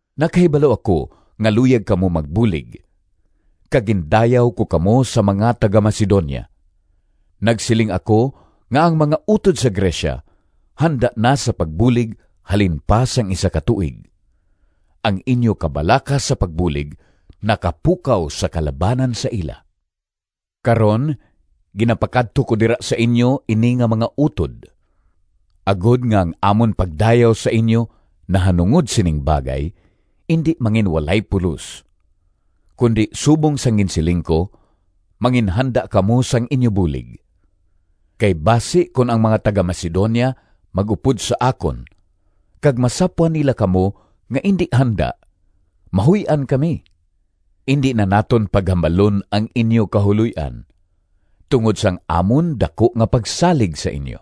Nakahibalo ako nga luyag kamo magbulig, kag gindayaw ko kamo sa mga taga-Macedonia. Nagsiling ako nga ang mga utod sa Grecia handa na sa pagbulig halin pa sang isa ka tuig. Ang inyo kabalaka sa pagbulig nakapukaw sa kalabanan sa ila. Karon ginapakadto ko dira sa inyo ini nga mga utod, agod nga ang amon pagdayaw sa inyo nahanungod sining bagay indi manginwalay pulos, kundi subong sang ginsiling ko, manginhanda kamo sang inyo bulig. Kay basi kon ang mga taga-Macedonia mag-upod sa akon kag masapwan nila kamo nga indi handa, mahuy-an kami (indi na naton paghambalon ang inyo kahuloy-an) tungod sang amon daku nga pagsalig sa inyo!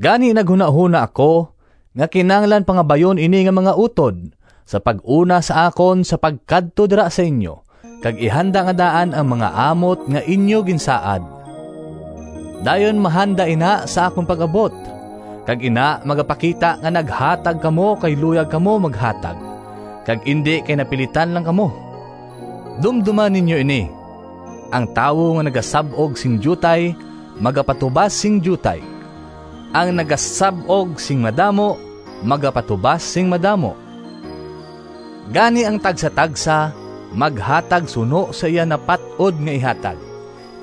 Gani naghunahona ako nga kinahanglan pangabayon ini nga mga utod sa pag-una sa akon sa pagkadto dira sa inyo kag ihanda nga daan ang mga amot nga inyo ginsaad. Dayon mahanda ina sa akon pag-abot, kag ina magapakita nga naghatag kamo kay luyag kamo maghatag, kag indi kay napilitan lang kamo. Dumdoma ninyo ini: ang tawo nga nagasab-og sing diutay magapatubas sing diutay. Ang nagasab-og sing madamo magapatubas sing madamo. Gani ang tagsatagsa maghatag suno sa iya napat-od nga ihatag,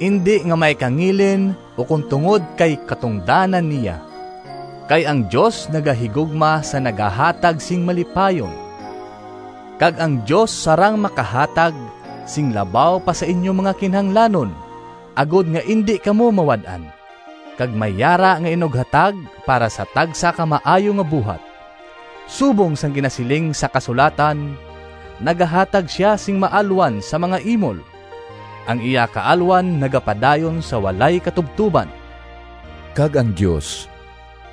indi nga may kangilin ukon tungod kay katungdanan niya, kay ang Dios nagahigugma sa nagahatag sing malipayon. Kag ang Dios sarang makahatag sing labaw pa sa inyo mga kinahanglanon agod nga indi kamo mawad-an, kag may yara nga inughatag para sa tagsa ka maayo nga buhat. Subong sang ginasiling sang kasulatan: “Nagahatag sia sing maalwan Sa mga imol, Ang iya kaalwan nagapadayon Sa walay katubtoban.” Kag ang Dios,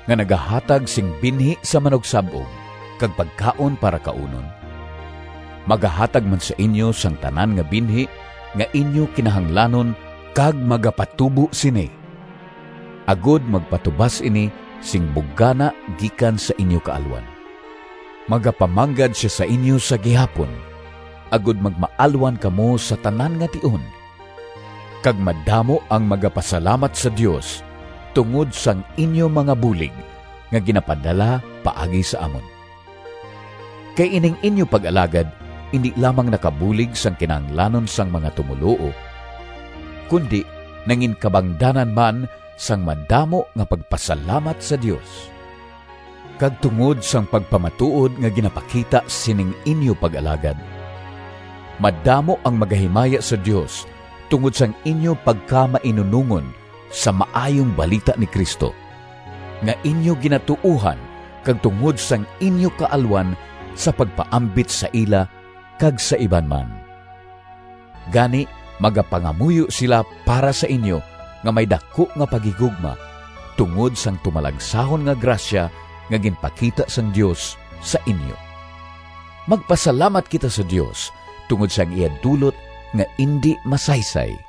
nga nagahatag sing binhi sa manugsab-og kag pagkaon para kaunon, magahatag man sa inyo sang tanan nga binhi nga inyo kinahanglanon kag magapatubo sini, agod magpatubas ini sing bugana gikan sa inyo kaalwan. Magapamanggad sia sa inyo sa gihapon agod magmaalwan kamo sa tanan nga tion, kag madamo ang magapasalamat sa Dios tungod sang inyo mga bulig nga ginapadala paagi sa amon. Kay ining inyo pag-alagad indi lamang nakabulig sang kinahanglanon sang mga tumoluo, kundi nanginkabangdanan man sang madamo nga pagpasalamat sa Dios. Kag tungod sang pagpamatuod nga ginapakita sining inyo pag-alagad, madamo ang magahimaya sa Dios tungod sang inyo pagkamainunongon sa Maayong Balita ni Cristo, nga inyo ginatuohan kag tungod sang inyo kaalwan sa pagpaambit sa ila kag sa iban man. Gani magapangamuyo sila para sa inyo nga may daku nga paghigugma tungod sang tumalagsahon nga grasya nga ginpakita sang Dios sa inyo. Magpasalamat kita sa Dios tungod sang iya dulot nga indi masaysay!